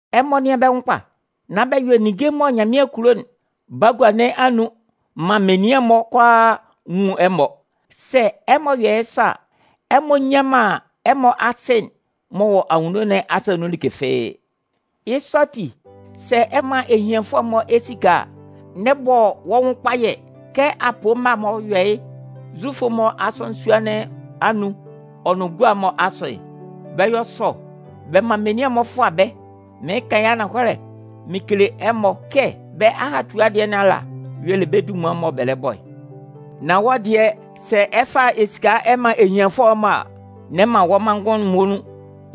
“Ɛmɔ nɩ́an bɛ́ nwʋn kpa! Nán bɛ yɔ ninnge mɔ Nyanmɩan kulo'n bagua nɩn anun maan menian'n-mɔ kʋalaa nwun ɛmɔ. Sɛ ɛmɔ yɔ yɩ́ sɔ a, ɛmɔ nnyan man ɛmɔ Asɩ m'ɔ wɔ anwunno nɩn asa nun like fɩ́ɩ́. “Yɩ́ sɔ ati, sɛ ɛ 'man ehianfʋɛ'n-mɔ esika a, n'ɛ bɔ wɔ́ nwʋn kpayɛ kɛ apoo mma'n-mɔ yɔ yɩ́ Zufʋ'n-mɔ asɔnɩn sua'n-mɔ anun'n ɔ nʋn gua'n-mɔ asʋ'n. Bɛ yɔ sɔ bɛ man menian'n-mɔ fʋa bɛ́. Mɩɩn kan yɩ́ ananhɔlɛ mɩn kele ɛmɔ kɛ bɛ́ ahatua dɩɛ nɩn ala y'ɔ le bɛ́ dunman'n mɔ bɛ lɛ bɔ'n. Nan wɔ́ dɩɛ, sɛ ɛ 'fa esika ɛ man ehianfʋɛ'n-mɔ a, n'ɛ man wɔ́ manngʋn'n muonun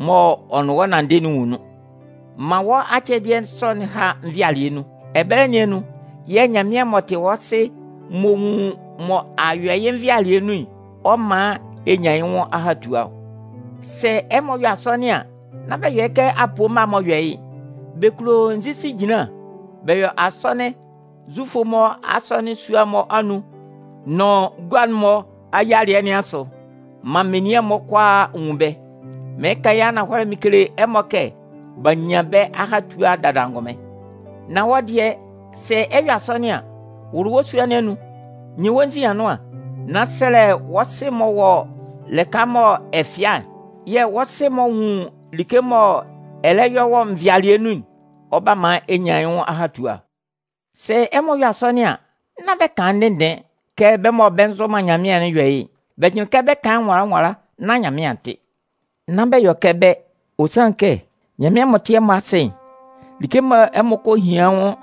mɔ ɛ nʋn yɩ́ nanndɩ'n nwun nun. Man wɔ́ acɛdɩɛ sɔ'n há nvɩalɩɛ nun. Ɛbɛlɛ nɩn anun yɛ̂ Nyanmɩan m'ɔ tɩ wɔ́ Sɩ m'ɔ nwun mɔ a yɔ yɩ́ nvɩalɩɛ nun'n, ɔ 'man ɛ nyan yɩ́ nwʋn ahatua ɔ. “Sɛ ɛmɔ 'yɔ asɔnɩn an, nán bɛ yɔ kɛ apoo mma'n-mɔ yɔ yɩ́'n. Bɛ kulo nzisi ejinlan bɛ yɔ asɔnɩn Zufʋ'n-mɔ asɔnɩn sua'n-mɔ anun nʋn gua'n-mɔ ayialɩɛ nɩn asʋ maan menian'n-mɔ kʋalaa nwun bɛ́. Mɩɩn kan yɩ́ ananhɔlɛ mɩn kele ɛmɔ kɛ b'a nyan bɛ́ ahatua'n dada angʋnmɩn. Nan wɔ́ dɩɛ, sɛ ɛ 'yɔ asɔnɩn an, wʋlʋ wɔ́ sua nɩn anun, nyin wɔ́ nzin anʋan, nán sɛlɛ wɔ́ Sɩ m'ɔ wɔ wɔ́ lɩka mɔ ɛ fɩa'n. Yɛ̂ wɔ́ Sɩ m'ɔ nwun like mɔ ɛ lɛ yɔ yɩ́ nvɩalɩɛ nun'n, ɔ 'ba man ɛ nyan yɩ́ nwʋn ahatua. Sɛ ɛmɔ 'yɔ asɔnɩn an, nán bɛ kan ndɩnndɩɩn kɛ bɛ́ mɔ bɛ nzʋ man Nyanmɩan'n yɔ yɩ́'n. Bɛ jʋnlɩn kɛ bɛ 'kan yɩ́ nwala nwala nán Nyanmɩan a tɩ. Nán bɛ yɔ kɛ bɛ́, ɔ sanlɩn kɛ, Nyanmɩan m'ɔ tɩ ɛmɔ Asɩ'n, like mɔ ɛmɔ kɔ hian yɩ́ nwʋn'n,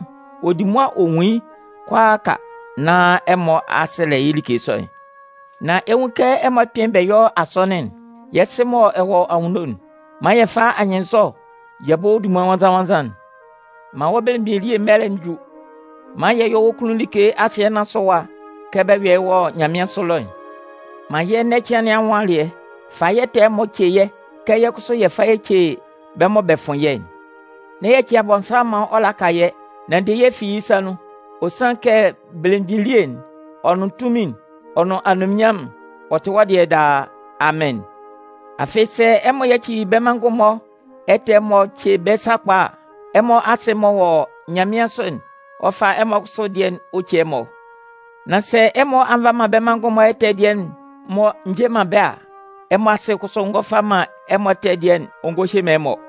ɔ di mʋa ɔ nwun yɩ́ kʋalaaka nán ɛmɔ a sɛlɛ yɩ́ like sɔ'n. “Nan ɛ 'nwun kɛ ɛmɔ kpɩ́n bɛ yɔ́ asɔnɩn'n: Yɛ́ Sɩ mɔ ɛ wɔ anwunno, man yɛ fá anyɩnnzɔ yɛ bɔ́ wɔ́ dunman nwannzan-nwannzan'n. Man wɔ́ belemgbin elie mɛlɛ'n jú. Man yɛ yɔ́ wɔ́ kunnun like asɩɛ nɩn asʋ ɛwa kɛ bɛ yɔ yɩ́ wɔ nyanmɩansʋ ɛlɔ'n. Man yɛ́ ɛnɛ cɩan nɩn anwʋn alɩɛ. Fa yɛ́ ɛtɛ'n-mɔ ce yɛ́ kɛ yɛ́ kʋsʋ yɛ fa yɛ ce bɛ́ mɔ bɛ fʋn yɛ́'n. N'ɛ yaci Abɔnsanmʋn maan ɔ laka yɛ́, nan de yɛ́ fi yɩ́ sa nun. [Ɔ sanlɩn kɛ belemgbin elie'n, ɔ nʋn tunmin'n, ɔ nʋn anunminnyanmʋn'n, ɔ tɩ wɔ́ dɩɛ daa. Amɩn.] “Afɩ sɛ ɛmɔ yaci bɛ́ manngʋn'n-mɔ ɛtɛ'n-mɔ ce bɛ́ sakpa a, ɛmɔ Asɩ m'ɔ wɔ nyanmɩansʋ'n, ɔ 'fa ɛmɔ kʋsʋ dɩɛ'n-mɔ ɔ ce ɛmɔ. Nan sɛ ɛmɔ nva man bɛ́ manngʋn'n-mɔ ɛtɛ dɩɛ'n-mɔ nje man bɛ́ a, ɛmɔ Asɩ'n kʋsʋ ngɔ fa man ɛmɔ ɛtɛ dɩɛ'n-mɔ ɔ ngɔ hye man ɛmɔ.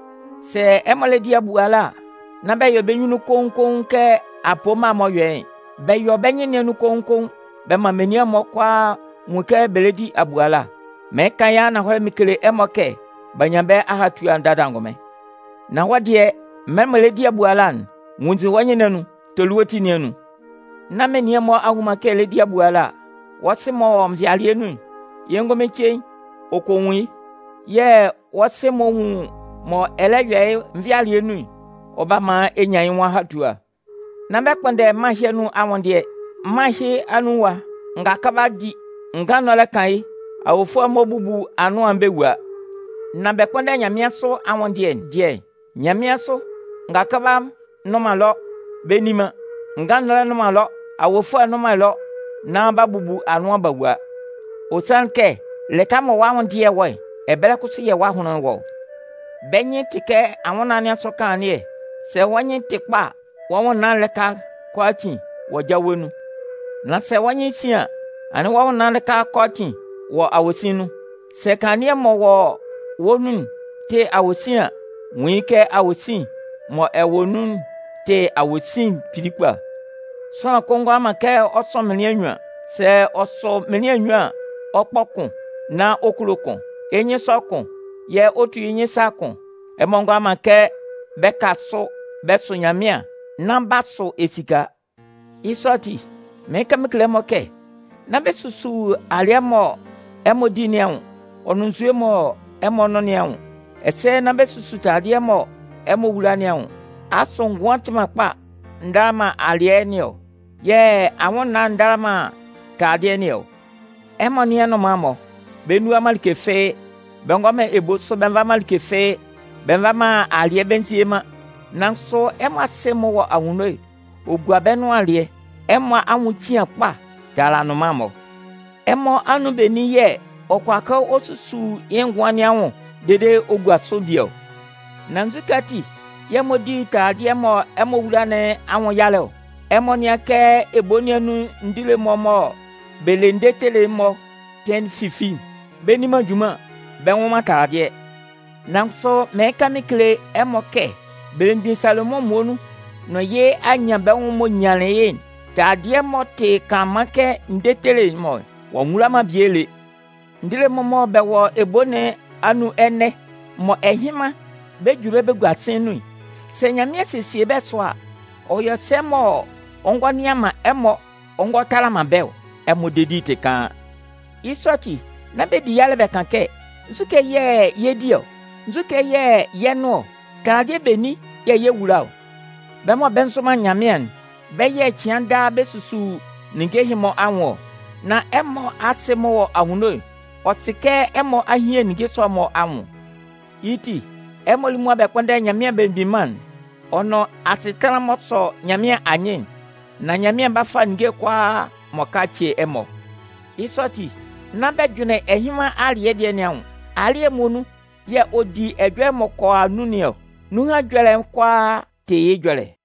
“Sɛ ɛmɔ lɛ di abuala a, nán bɛ yɔ bɛ́ nyunnun koun-koun kɛ apoo mma'n-mɔ yɔ yɩ́'n. Bɛ yɔ bɛ́ nyɩn nɩn anun koun-koun bɛ man menian'n-mɔ kʋalaa nwun kɛ bɛ lɛ di abuala. Mɩɩn kan yɩ́ ananhɔlɛ mɩn kele ɛmɔ kɛ b'a nyan bɛ́ ahatua'n dada angʋnmɩn. Nan wɔ́ dɩɛ, mɛlɛ mɔ ɛ lɛ di abuala'n, nwunnzin wɔ́ nyunnun, toli wɔ́ ti nɩn anun, nán menian'n-mɔ a nnwun man kɛ ɛ lɛ di abuala. Wɔ́ Sɩ'n m'ɔ wɔ nvɩalɩɛ nun'n, yɩ́ ngʋnmɩn cein ɔ kɔ nwun yɩ́. Yɛ̂ wɔ́ Sɩ'n m'ɔ nwun mɔ ɛ lɛ yɔ yɩ́ nvɩalɩɛ nun'n, ɔ 'ba man ɛ nyan yɩ́ nwʋn ahatua. “Nán bɛ kpʋ́nndɛ mân ɛhɩ anun anwʋndɩɛ'n. Mân ɛhɩ anun ɛwa, ngakʋba di, ngannɔlɛ kan yɩ́, awofʋɛ'n-mɔ bubu anʋan bɛ wua. Nan bɛ kpʋnndɛ nyanmɩansʋ anwʋndɩɛ dɩɛ'n. Nyanmɩansʋ, ngakʋba nnʋn man ɛlɔ bɛ nni man, ngannɔlɛ nnʋn man ɛlɔ, awofʋɛ nnʋn man ɛlɔ nán b'a bubu anʋan b'a wua. Ɔ sanlɩn kɛ lɩka mɔ wɔ́ anwʋndɩɛ'n wɔ'n, ɛbɛlɛ kʋsʋ yɛ̂ wɔ́ ahʋnlɩn'n wɔ ɔ. “Bɛ́ nyɩn'n tɩ kɛ anwʋnnaan nɩn asʋ kanlannɩɛ: sɛ wɔ́ nyɩn'n tɩ kpa a, wɔ́ nwʋnnaan'n lɩka kʋalaatin wɔ jawe nun. Nan sɛ wɔ́ nyɩn'n sin an, anɩn wɔ́ nwʋnnaan'n lɩka kʋalaatin wɔ awosin nun. Sɛ kanlannɩɛ'n m'ɔ wɔ wɔ́ nun'n tɩ awosin an, nwun yɩ́ kɛ awosin'n mɔ ɛ wɔ nun'n tɩ awosin kpili kpa. “Sʋanlan kʋn ngʋala man kɛ ɔ sʋ mɩnlɩan nnyuan. Sɛ ɔ sʋ mɩnlɩan nnyuan an, ɔ 'kpɔ kʋn nán ɔ kulo kʋn. Yɩ́ nyɩn 'sɔ kʋn yɛ́ ɔ 'tu yɩ́ nyɩn sa kʋn. Ɛmɔ ngʋala man kɛ bɛ ka sʋ bɛ sʋ Nyanmɩan nán b'a sʋ esika. “Yɩ́ sɔ ati, mɩɩn kan mɩn kele ɛmɔ kɛ: Nán bɛ susu alɩɛ mɔ ɛmɔ 'di nɩn anwʋn, ɔ nʋn nzue mɔ ɛmɔ 'nʋn nɩn anwʋn. Ɛsɛ nán bɛ susu taladɩɛ mɔ ɛmɔ 'wula nɩn anwʋn. Asʋ ngʋan'n tɩ man kpa ndala man alɩɛ nɩn ɔ? Yɛ̂ anwʋnnaan'n ndala man taladɩɛ nɩn ɔ? Ɛmɔ nɩ́an nnʋnman'n-mɔ. Bɛ nnua man like fɩ́ɩ́, bɛ ngɔ man ebo sʋ bɛ nva man alɩɛ fɩ́ɩ́, bɛ nva man alɩɛ bɛ nzie man, nan kʋsʋ ɛmɔ Asɩ m'ɔ wɔ anwunno'n, ɔ gua bɛ́ nʋan alɩɛ! Ɛmɔ anwʋn cian kpa tala nnʋnman'n-mɔ. Ɛmɔ anun benin yɛ̂ ɔ kʋala ɔ susu yɩ́ ngʋan nɩn anwʋn dede ɔ gua sʋ bie ɔ? Nán nzukɛ ati yɛ̂ ɛmɔ di taladɩɛ mɔ ɛmɔ 'wula nɩn anwʋn yalɛ ɔ? Ɛmɔ nɩ́an kɛ ebo nɩn anun ndile'n-mɔ mɔ bɛ le ndetele'n-mɔ kpɩn fifi'n. Bɛ nni man junman, bɛ nnwʋn man taladɩɛ. Nan kʋsʋ mɩɩn kan mɩn kele ɛmɔ kɛ belemgbin Salomʋn muonun nʋn yɩ́ anyanbɛnwʋn'n m'ɔ nyanlɩn yɩ́'n, taladɩɛ m'ɔ tɩ kanlanman kɛ ndetele'n-mɔ'n, ɔ'a nwula man bie lé. Ndile'n-mɔ mɔ bɛ wɔ ebo nɩn anun ɛnɛ, mɔ ɛhɩnman bɛ 'ju bɛ́ bɛ gua sɩ̂n nun'n, sɛ Nyanmɩan sesie bɛ́ sʋa, ɔ yɔ sɛ mɔ ɔ ngɔ nɩan man ɛmɔ ɔ ngɔ tala man bɛ́ ɔ? Ɛmɔ dedi'n tɩ kaan! Yɩ́ sɔ ati, nán bɛ di yalɛ bɛ kan kɛ: Nzukɛ yɛ̂ yɛ 'di ɔ? Nzukɛ yɛ̂ yɛ 'nʋn ɔ? Taladɩɛ benin yɛ̂ yɛ 'wula ɔ? Bɛ́ mɔ bɛ nzʋ man Nyanmɩan'n, bɛ́ yɛ̂ cɩan daa bɛ susu ninnge ɛhɩ-mɔ anwʋn ɔ. Nan ɛmɔ Asɩ'n m'ɔ wɔ anwunno'n, ɔ sɩ kɛ ɛmɔ a hian ninnge sɔ'n-mɔ anwʋn. Yɩ́ ti, ɛmɔ lí mʋa bɛ kpʋ́nndɛ Nyanmɩan Belemgbin Mân'n, ɔ nʋn asɩtanlan'n m'ɔ sɔ Nyanmɩan anyɩn'n, nán Nyanmɩan 'ba fa ninnge'n kʋalaa m'ɔ ka'n ce ɛmɔ. Yɩ́ sɔ ati, nán bɛ jʋnlɩn ɛhɩnman alɩ́ɛ dɩɛ nɩn anwʋn. Alɩ́ɛ'n muonun yɛ̂ ɔ 'di ɛjɔlɛ'n m'ɔ kɔ a nun nɩn ɔ. Nunhan ɛjɔlɛ'n kʋalaa tɩ yɩ́ ɛjɔlɛ.